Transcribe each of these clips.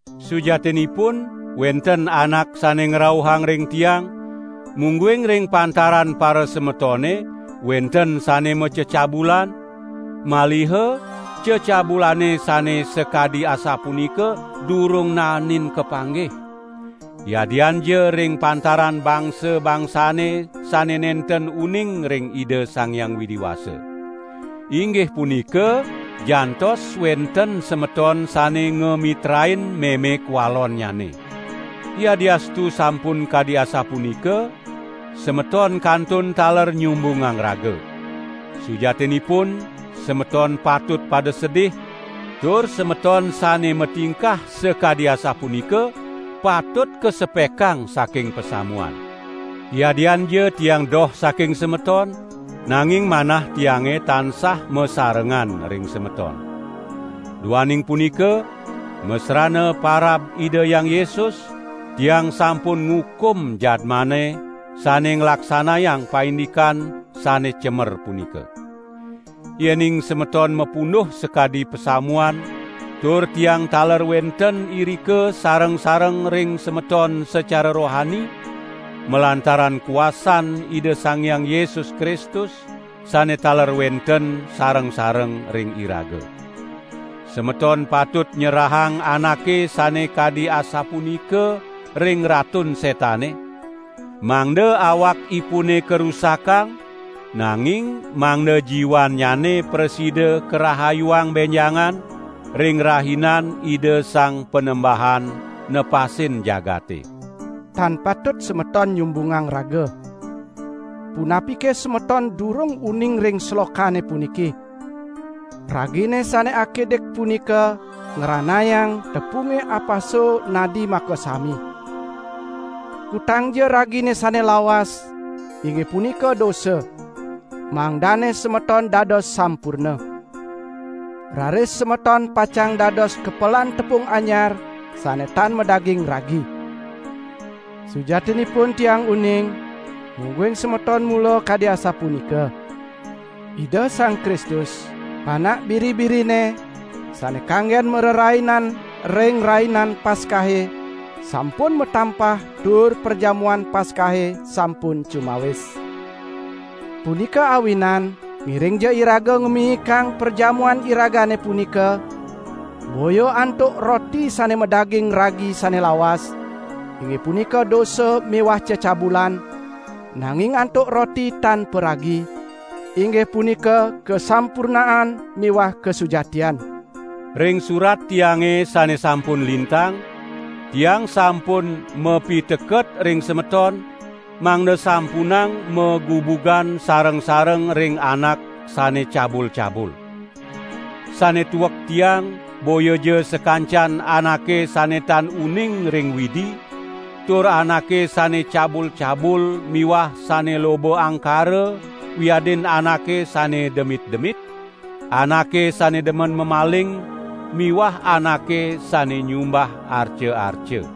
Sujatinipun wenten anak sane ngrauhang ring tiang, mungguing ring pantaran parasemetone wenten sane macecabulan; maliha cecabulane sane sakadi asapunika durung naenin kapanggih, yadianja ring pantaran bangsa-bangsane sane nenten uning ring Ida Sang Hyang Widi Wasa. Inggih punika jantos wenten semeton sane ngamitrain meme kwalonnyane. Yadiastu sampun kadi asapunika, semeton kantun taler nyumbungang raga. Sujatinipun semeton patut pada sedih, tur semeton sane matingkah sakadi asapunika patut kasepekang saking pasamuan. Yadianja tiang doh saking semeton, nanging manah tiange tansah masarengan ring semeton. Duaning punika masrana parab Ida Hyang Yesus, tiang sampun ngukum jadmane sane nglaksanayang paindikan sane cemer punika. Yening semeton mapunduh sakadi pasamuan tur tiang taler wenten irika sareng-sareng ring semeton sacara rohani, malantaran kuasan Ida Sang Hyang Yesus Kristus, sane taler wenten sareng-sareng ring iraga. Semeton patut nyerahang anake sane kadi asapunika ring Ratun Setane, mangda awakipune karusakang, nanging mangda jiwannyane prasida, karahayuang benjangan ring Rahinan Ida Sang Panembahan nepasin jagate. Tan patut semeton nyumbungang raga! Punapike semeton durung uning ring slokane puniki: "Ragine sane akidik punika ngranayang tepunge apaso nadi makasami?" Kutangja ragine sane lawas, inggih punika dosa, mangdane semeton dados sampurna. Raris semeton pacang dados kepelan tepung anyar sane tan madaging ragi. Sujatinipun tiang uning, mungguing semeton mula kadi asapunika. Ida Sang Kristus, panak biri-birine sane kanggen marerainan ring Rainan Paskahe sampun matampah tur perjamuan Paskahe sampun cumawis. Punika awinan ngiringja iraga ngamiyikang perjamuan iragane punika, boya antuk roti sane madaging ragi sane lawas, inggih punika dosa miwah cecabulan, nanging antuk roti tan paragi, inggih punika kasampurnaan miwah kasujatian. Ring surat tiange sane sampun lintang, tiang sampun mapiteket ring semeton mangda sampunang magubugan sareng-sareng ring anak sane cabul-cabul. Sane tuek tiang boyaja sakancan anake sane tan uning ring Widi, tur anake sane cabul-cabul miwah sane loba angkara wiadin anake sane demit-demit, anake sane demen mamaling miwah anake sane nyumbah arca-arca.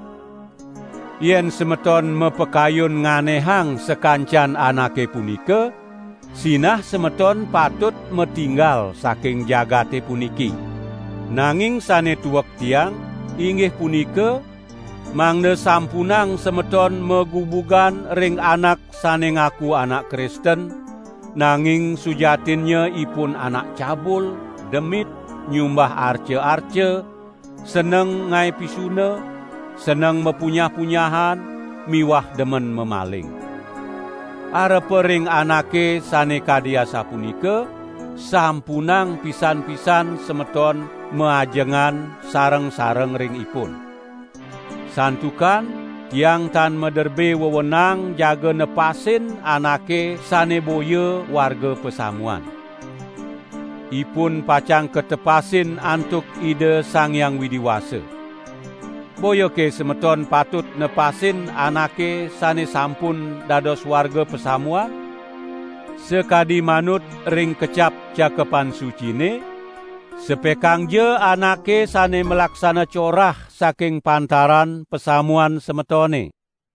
Yen semeton mapakayun nganehang sakancan anake punika, sinah semeton patut matinggal saking jagate puniki. Nanging sane tuek tiang, inggih punika, mangda sampunang semeton magubugan ring anak sane ngaku anak Kristen, nanging sujatinnya ipun anak cabul, demit, nyumbah arca-arca, seneng ngae pisuna, seneng mapunyah-punyahan miwah demen mamaling. Arepa ring anake sane kadi asapunika, sampunang pisan-pisan semeton maajengan sareng-sareng ring ipun. Santukan tiang tan maderbe wewenang jaga nepasin anake sane boya warga pasamuan. Ipun pacang katepasin antuk Ida Sang Hyang Widi Wasa. Boyake semeton patut nepasin anake sane sampun dados warga pasamuan? Sakadi manut ring kecap Cakepan Sucine: "Sepekangja anake sane malaksana corah saking pantaran pasamuan semetone."